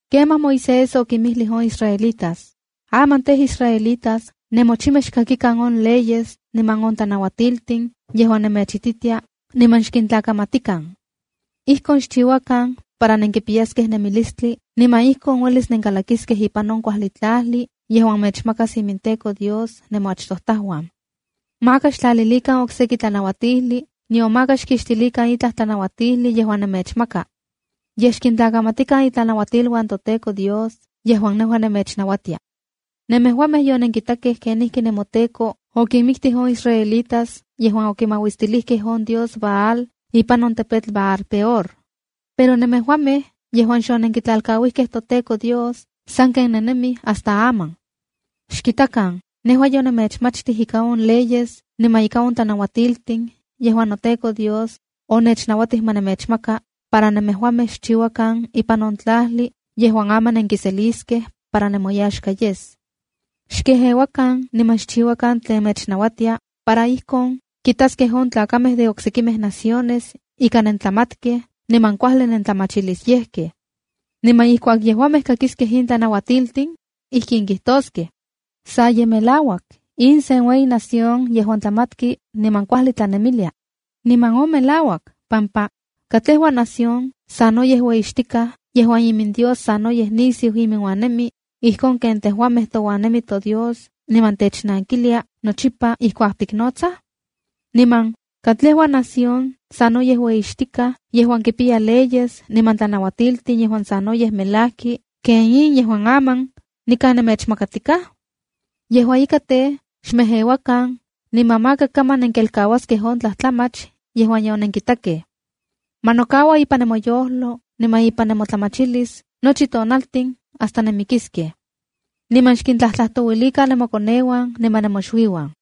’Kemaj Moisés okinmijlij on israelitas: ‘Aman tej, israelitas, nemochimej xkakikan on leyes niman on tlanauatiltin yejuan nemechititia, niman xkintlakamatikan. Ijkon xchiuakan para nenkipiyaskej nemilistli niman ijkon uelis nenkalakiskej ipan on kuajli tlajli yejuan mechmakas iminTEKO Dios nemoachtojtajuan. Maka xtlalilikan okseki tlanauatijli nion maka xkixtilikan itlaj tlanauatijli yejuan nemechmaka. Yej xkintlakamatikan itlanauatiluan toTEKO Dios, yejuan nejua nemechnauatia. Nemejuamej yonenkitakej kenijki nemoTEKO okinmiktij on israelitas yejuan okimauistilijkej on dios Baal ipan on tepetl Baal-peor. Pero nemejuamej yejuan xonenkitlalkauijkej toTEKO Dios sanken nennemij hasta aman. ’Xkitakan, nejua yonemechmachtij ika on leyes niman ika on tlanauatiltin yejuan noTEKO Dios onechnauatij ma nemechmaka para nemejuamej xchiuakan ipan on tlajli yejuan aman nenkiseliskej para nemoyaxka yes. Xkejeuakan niman xchiuakan tlen mechnauatia, para ijkon kitaskej on tlakamej de oksekimej naciones ika nentlamatkej niman kuajli nentlamachilisyejkej. Niman ijkuak yejuamej kakiskej in tlanauatiltin, ijkin kijtoskej: ‘Sa ye melauak, in sen ueyi nación yejuan tlamatki niman kuajli tlanemilia.’ Niman on melauak pampa ¿katlejua nación sanoyej ueyixtikaj yejuan imindios sanoyej nisiu iminuan nemi, ijkon ken tejuamej touan nemi toDios niman technankilia nochipa ijkuak tiknotsaj? Niman, ¿katlejua nación sanoyej ueyixtikaj yejuan kipiya leyes niman tlanauatiltin yejuan sanoyej melajki ken in yejuan aman nikan nemechmakatikaj? ’Yejua ika tej, xmejeuakan, niman maka kaman nenkelkauaskej on tlajtlamach yejuan yonenkitakej. Ma nokaua ipan nemoyojlo niman ipan nemotlamachilis nochi tonaltin hasta nenmikiskej. Niman xkintlajtlajtouilikan nemokoneuan niman nemoxuiuan.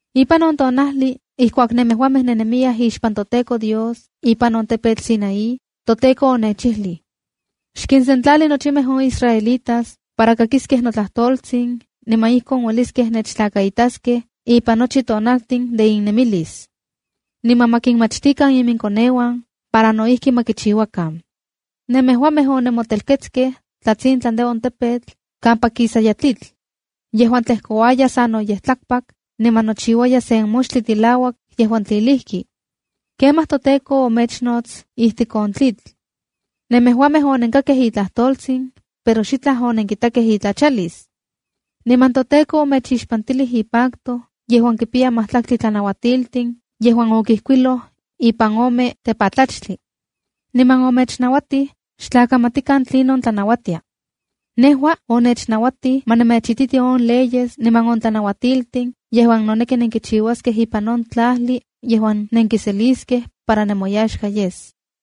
’Ipan on tonajli ijkuak nemejuamej nennemiyaj ixpan toTEKO Dios ipan on tepetl Sinaí, toTEKO onechijlij: ’ Xkinsentlali nochimej on israelitas para kakiskej notlajtoltsin niman ijkon ueliskej nechtlakaitaskej ipan nochi tonaltin de innemilis. Niman ma kinmachtikan iminkoneuan para no ijki ma kichiuakan.’ Nemejuamej onenmotelketskej tlatsintlan de on tepetl, kampa kisaya tlitl, yejuan tlejkouaya sanoyej tlakpak, niman nochiuaya sen moxtli tilauak yejuan tlilijki. Kemaj toTEKO omechnots ijtik on tlitl. Nemejuamej onenkakkej itlajtoltsin, pero xitlaj onenkitakej itlachalis. Niman toTEKO omechixpantilij ipacto yejuan kipiya majtlaktli tlanautiltin, yejuan okijkuiloj ipan ome tepatlachtli. Niman omechnauatij xtlakamatikan tlinon tlanauatia. Nejua onechnauatij ma nemechititi on leyes niman on tlanauatiltin yejuan noneki nenkichiuaskej ipan on tlajli yejuan nenkiseliskej para nemoyaxka yes.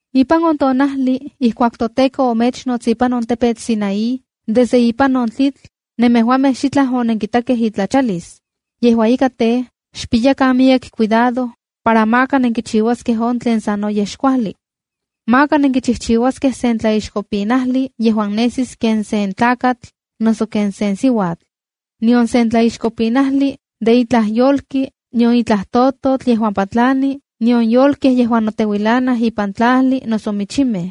’Ipan on tonajli ijkuak toTEKO omechnots ipan on tepetl Sinaí desde ipan on tlitl, nemejuamej xitlaj onenkitakej itlachalis. Yejua ika tej, xpiyakan miyek cuidado, para maka nenkichiuaskej on tlen sanoyej xkuajli. Maka nenkichijchiuaskej sen tlaixkopinajli yejuan nesis ken sen tlakatl noso ken sen siuatl, nion sen tlaixkopinajli de itlaj yolki, nion itlaj tototl yejuan patlani, nion yolkej yejuan noteuilanaj ipan tlajli noso michimej.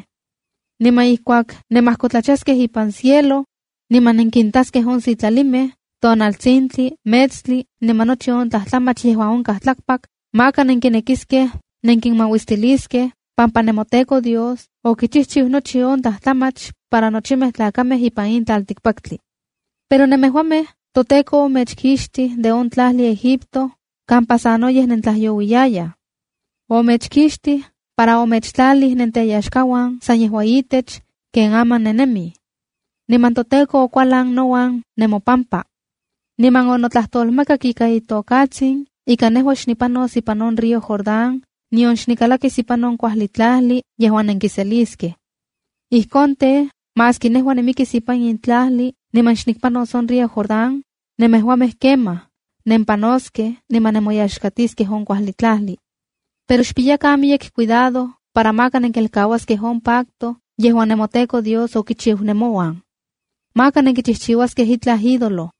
Niman ijkuak nemajkotlachaskej ipan cielo, niman nenkintaskej on sitlalimej, tonaltsintli, metstli, niman nochi on tlajtlamach yejuan onkaj tlakpak, maka nenkinekiskej nenkinmauistiliskej, pampa nemoTEKO Dios okichijchiu nochi on tlajtlamach para nochimej tlakamej ipan in tlaltikpaktli. Pero nemejuamej, toTEKO omechkixtij de on tlajli Egipto kampa sanoyej nentlajyouiyayaj. Omechkixtij para omechtlalij nenteyaxkauan san yejua itech, ken aman nennemij. Niman toTEKO okualan nouan nemopampa, niman onotlajtolmakak ika itokatsin ika nejua xnipanos ipan on río Jordán, nion xnikalakis ipan on kuajli tlajli yejuan nenkiseliskej. Ijkon tej, maski nejua nimikis ipan in tlajli niman xnikpanos on río Jordán, nemejuamej kemaj, nempanoskej niman nemoyaxkatiskej on kuajli tlajli. Pero xpiyakan miyek cuidado para maka nenkelkauaskej on pacto yejuan nemoTEKO Dios okichiu nemouan. Maka nenkichijchiuaskej itlaj ídolo,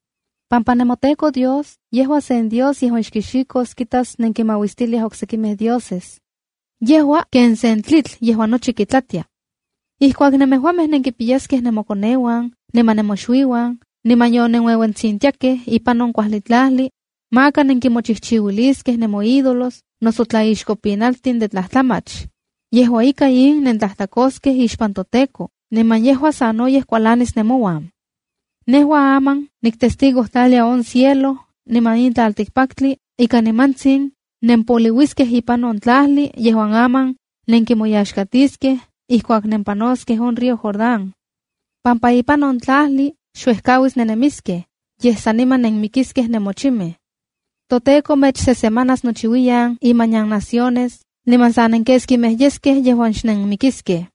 pampa nemoTEKO Dios, yejua sen Dios yejuan xkixikos kitas nenkinmauistiliaj oksekimej dioses. ¡Yejua ken sen tlitl yejuan nochi kitlatia! ’Ijkuak nemejuamej nenkimpiyaskej nemokoneuan niman nemoxuiuan, niman yonenueuentsintiakej ipan on kuajli tlajli, maka nenkimochijchiuiliskej nemoídolos noso tlaixkopinaltin de tlajtlamach. Yejua ika, in nentlajtlakoskej ixpan toTEKO, niman yejua sanoyej kualanis nemouan. Nejua aman niktestigojtlalia on cielo niman in tlaltikpaktli, ika nimantsin nempoliuiskej ipan on tlajli yejuan aman nenkimoyaxkatiskej, ijkuak nempanoskej on río Jordán. Pampa ipan on tlajli, xuejkauis nennemiskej, yej saniman nenmikiskej nemochimej. ToTEKO mechsesemanas nochiuiyan imanian naciones, niman sa nenkeskimej yeskej yejuan xnenmikiskej.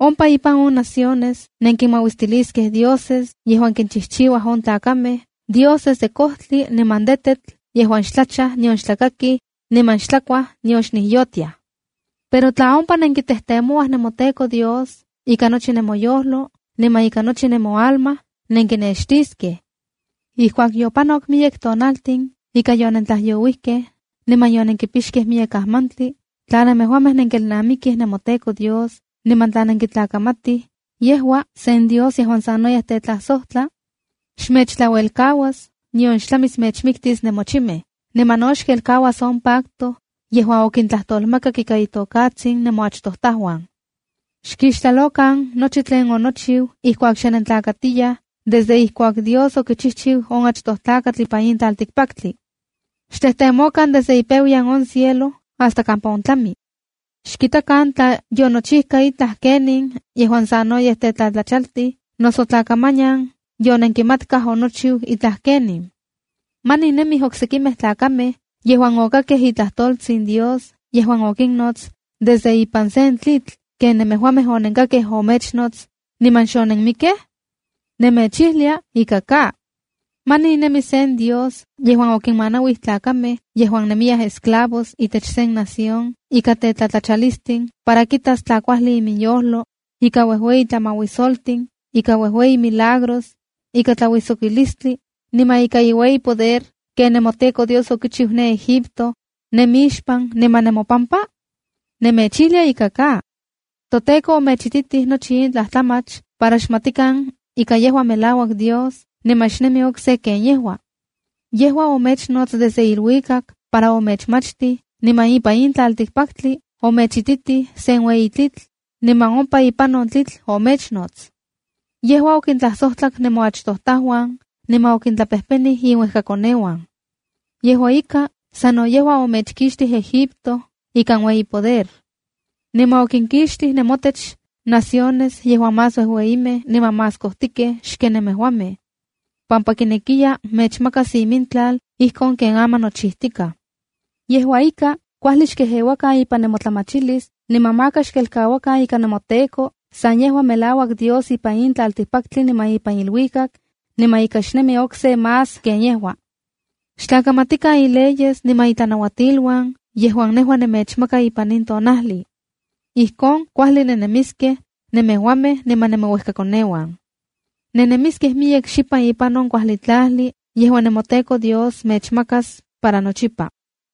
Ompa ipan on naciones nenkinmauistiliskej dioses yejuan kinchijchiuaj on tlakamej, dioses de kojtli niman de tetl yejuan xtlachaj nion xtlakakij, niman xtlakuaj, nion xnijyotiaj. ’Pero tla ompa nenkitejtemouaj nemoTEKO Dios ika nochi nemoyojlo, niman ika nochi nemoalma, nenkinextiskej. Ijkuak yopanok miyek tonaltin ika yonentlajyouijkej niman yonenkipixkej miyek ajmantli, tla nemejuamej nenkelnamikij nemoTEKO Dios niman tla nenkitlakamatij, yejua sen Dios yejuan sanoyej tetlajsojtla. Xmechtlauelkauas, nion xtlamis mechmiktis nemochimej. Niman no xkelkauas on pacto yejuan okintlajtolmakak ika itokatsin nemoachtojtajuan. ’Xkixtlalokan nochi tlen onochiu ijkuak xe nentlakatiyaj, desde ijkuak Dios okichijchiu on achtoj tlakatl ipan tlaltikpaktli. Xtejtemokan desde ipeuyan on cielo hasta kampa ontlami. Xkitakan tla yonochijka itlaj kenin yejuan sanoyej tetlatlachaltij, noso tla kamanian yonenkimatkaj onochiu itlaj kenin. ¿Manin nemij oksekimej tlakamej yejuan okakkej itlajtoltsin Dios yejuan okinnots desde ipan sen tlitl ken nemejuamej onenkakkej omechnots niman xonenmikkej? Nemechijlia: Ika ka. ¿Manin nemi sen dios yejuan okinmanauij tlakamej yejuan nemiyaj esclavos itech sen nación ika tetlatlatalistin para kitas tla kuajli iminyojlo, ika uejueyi tlamauisoltin, ika uejueyi milagros, ika tlauijsokilistli niman ika iueyi poder ken nemoTEKO Dios okichiu ne Egipto, nemixpan niman nemopampa? Nemechijlia: Ika ka. ToTEKO omechtitij nochi in tlajtlamach para xmatikan ika yejua melauak Dios, niman xnemi okse ken yejua. Yejua omechnots desde iluikak para omechmachtij, niman ipan tlaltikpaktli omechititij sen ueyi tlitl, niman ompa ipan on tlitl omechnots. ’Yejua okintlajsojtlak nemoachtojtajuan, niman okintlapejpenij inuejkakoneuan. Yejua ika, sa no yejua omechkixtij Egipto ikan iueyi poder. Niman okinkixtij nemotech naciones yejuan más uejueyimej niman más kojtikej xken nemejuamej, pampa kinekiya mechmakas imintlal ijkon ken aman nochijtikaj. ’Yejua ika, kuajli xkejeuakan ipan nemotlamachilis niman maka xkelkauakan ika nemoTEKO san yejua melauak Dios ipan in tlaltikpaktli niman ipan iluikak, niman ika xnemi okse más ken yejua. Xtlakamatikan ileyes niman itlanauatiluan yejuan nejua nemechmaka ipan in tonajli. Ijkon kuajli nennemiskej, nemejuamej niman nemouejkakoneuan. Nennemiskej miyek xipan ipan on kuajli tlajli yejuan nemoTEKO Dios mechmakas para nochipa.”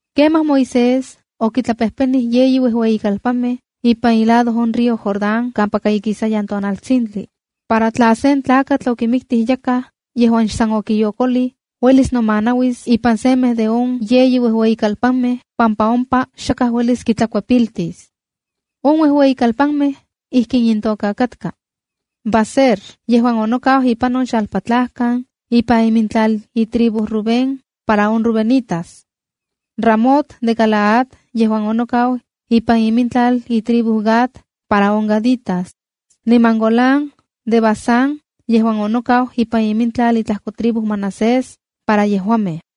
Kemaj Moisés okitlapejpenij yeyi uejueyikalpanmej ipan ilado on río Jordán kampaka ikisayan tonaltsintli, para tla sen tlakatl okimiktij yakaj yejuan xsan okiyokolij, uelis nomanauis ipan semej de on yeyi uejueyikalpanmej pampa ompa xakaj uelis kitlakuepiltis. On uejueyikalpanmej ijkin intoka katka: Baser, yejuan onokau ipan on xalpatlajkan ipan imintlal itribu Rubén para on rubenitas, Ramot de Galaad yejuan onokau ipan imintlal itribu Gad para on gaditas, niman Golán de Basán yejuan onokau ipan imintlal itlajko tribu Manasés para yejuamej.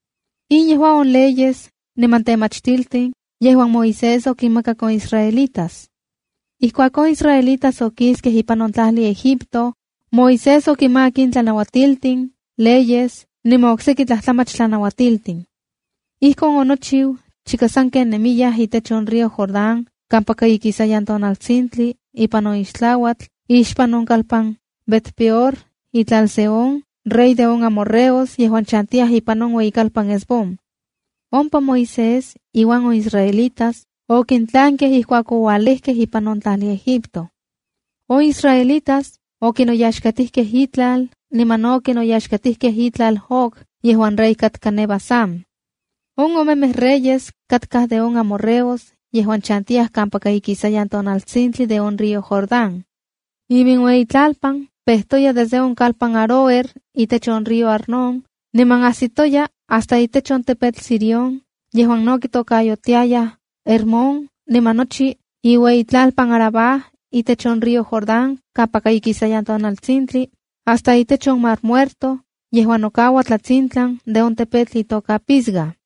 In yejua on leyes niman temachtiltin yejuan Moisés okinmakak on israelitas. Ijkuak on israelitas okiskej ipan on tlajli Egipto, Moisés okinmakak in tlanauatiltin, leyes niman okseki tlajtlamach tlanauatiltin. Ijkon okichiu chika sanken nemiyaj itech on río Jordán kampaka ikisayan tonaltsintli ipan on ixtlauatl ixpan on kalpan Bet-peor itlal Sehón, rey de on amorreos yejuan chantiya ipan on ueyikalpan Hesbón. Ompa Moisés iuan on israelitas okintlankej ijkuak oualejkej ipan on tlajli Egipto. On israelitas okinoyaxkatijkej itlal niman no okinoyaxkatijkej itlal Og yejuan rey katka ne Basán. On omemej reyes katkaj de on amorreos yejuan chantiyaj kampaka ikisayan tonaltsintli de on río Jordán. Iminueyitlalpan pejtoya desde on kalpan Aroer itech on río Arnón niman ajsitoya hasta itech on tepetl Sirión, yejuan no kitokayotiayaj Hermón, niman nochi iueyitlalpan Arabá itech on río Jordán kampaka ikisayan tonaltsintli hasta itech on Mar Muertoa yejuan nokaua tlatsintlan de on tepetl itoka Pisga.